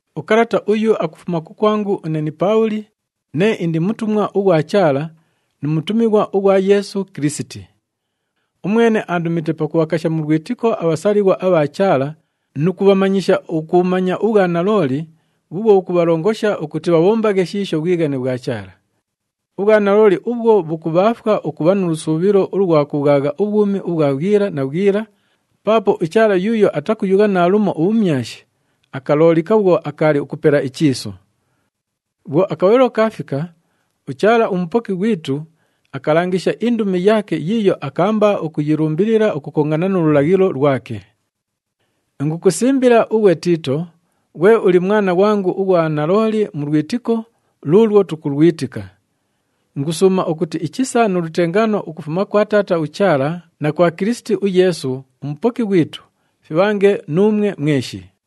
Ukalata uyu akufuma kukwangu une ni Paabhuli, nee indi mutumwa ughwa Chaala nu mutumighwa ughwa Yeesu Kilisiti. Umwene aandumite pakubhakasha mu lwitiko abhasalighwa abha Chaala nu kubhamanyisha ukubhumanya ubhwanalooli bhuubhwo bhukubhalongosha ukuti bhabhombaghe shiisho bhwighane bhwa Chaala. Ubhwanalooli ubhwo bhukubhaafwa ukubha nu lusuubhilo ulwa kubhwagha ubhwumi ubhwa bhwila na bhwila, paapo uChaala yuuyo atakuyugha naalumo ubhumyashi, akaloolika bhwo akaali ukupela ichiisu. Bhwo akabhalilo kaafika, uChaala uMupoki ghwitu akalangisha indumi yaake yiiyo akaamba ukuyilumbilila ukukongana nu lulaghilo lwake. Ingukusimbila ughwe Tiito, ghwe uli mwana ghwangu ughwa nalooli mu lwitiko luulwo tukulwitika. Ingusuuma ukuti ichisa nu lutengaano ukufuma kwa Taata uChaala na kwa Kilisiti uYeesu uMupoki ghwitu fibhange nuumwe mweshi.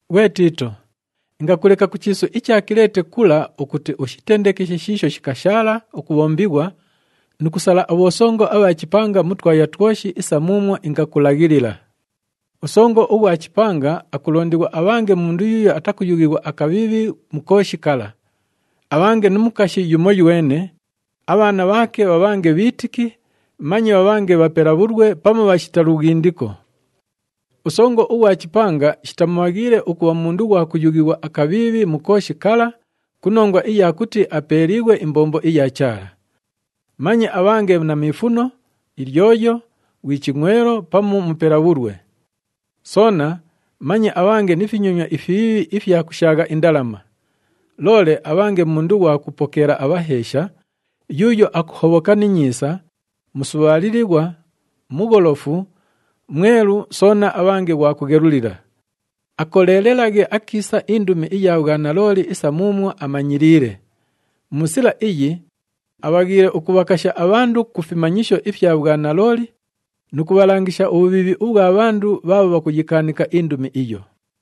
Ghwe Tiito, ingakuleka ku chiisu icha Kileete kula ukuti ushitendekeshe shiisho shikashaala ukubhombighwa nu kusala abhosongo abha chipanga mu twaya twoshi isa muumwo ingakulaghilila. Usongo ughwa chipanga akulondighwa abhange mundu yuuyo atakuyughighwa akabhiibhi mu kooshi kala. Abhange nu mukashi yumoywene, abhaana bhaake bhabhange bhiitiki, manye bhabhange bhapela bhulwe pamu bhashita lughindiko. Usongo ughwa chipanga shitamubhaghiile ukubha mundu ghwa kuyughighwa akabhiibhi mu kooshi kala ku nongwa iya kuti apeeliighwe imbombo iya Chaala. Manye abhange na miifuno, ilyoyo, ghwi chingʼwelo pamu mupela bhulwe. Soona manye abhange ni finyonywa ifibhiibhi ifya kushaagha indalama. Loole abhange mundu ghwa kupokeela abhaheesha, yuuyo akuhobhoka ni nyiisa, musubhaalilighwa, mugholofu, mwelu soona abhange ghwa kughelulila. Akoleelelaghe akiisa indumi iya bhwanalooli isa muumwo amanyiliile. Mu sila iyi, abhaghiile ukubhakasha abhandu ku fimanyisho ifya bhwanalooli nu kubhalangisha ubhubhiibhi ubhwa bhandu bhaabho bhakuyikaanika indumi iyo.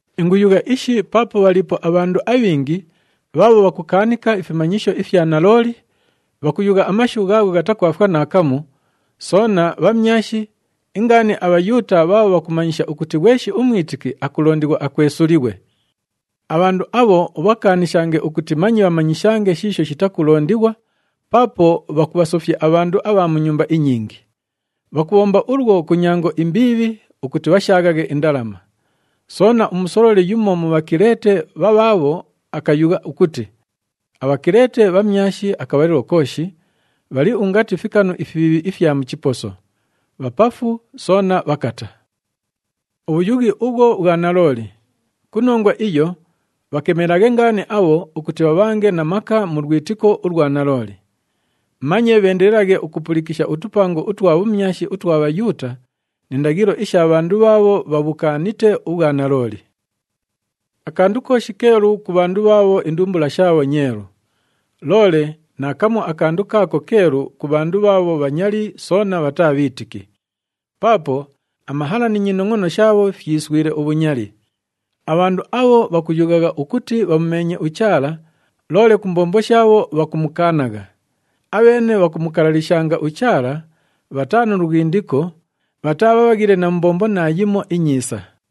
Inguyugha ishi paapo bhaliipo abhandu abhingi bhaabho bhakukaanika ifimanyisho ifya nalooli, bhakuyugha amashu ghaagho ghatakwafwa naakamu, soona bhamyashi, ingaani aBhayuuta bhaabho bhakumanyisha ukuti ghweshi umwitiki akulondighwa akwesulighwe. Abhandu abho ubhakaanishange ukuti manye bhamanyishange shiisho shitakulondighwa, paapo bhakubhasofya abhandu abha mu nyumba inyingi. Bhakubhomba ulwo ku nyango imbiibhi ukuti bhashaaghaghe indalama. Soona, umusololi yumo mu Bhakileete bhabhaabho akayugha ukuti, “ABhakileete bhamyashi akabhalilo kooshi, bhali ungati fikanu ifibhiibhi ifya mu chiposo. Bhapafu soona bhakata.” Ubhuyughi ubhwo bhwa nalooli. Ku nongwa iyo, bhakemelaghe ngaani abho ukuti bhabhange na maka mu lwitiko ulwa nalooli. Manye bheendelelaghe ukupulikisha utupango utwa bhumyashi utwa Bhayuuta ni ndaghilo isha bhandu bhaabho bhabhukaanite ubhwanalooli. Akandu kooshi keelu ku bhandu bhaabho indumbula shaabho nyeelu. Loole naakamu akandu kaako keelu ku bhandu bhaabho bhanyali soona bhataa bhiitiki. Paapo amahala ni nyinongʼono shaabho fyiswile ubhunyali. Abhandu abho bhakuyughagha ukuti bhamumeenye uChaala loole ku mbombo shaabho bhakumukaanagha. Abheene bhakumukalalishanga uChaala, bhataa nu lughindiko, bhataa bhabhaghile na mu mbombo naayimo inyiisa.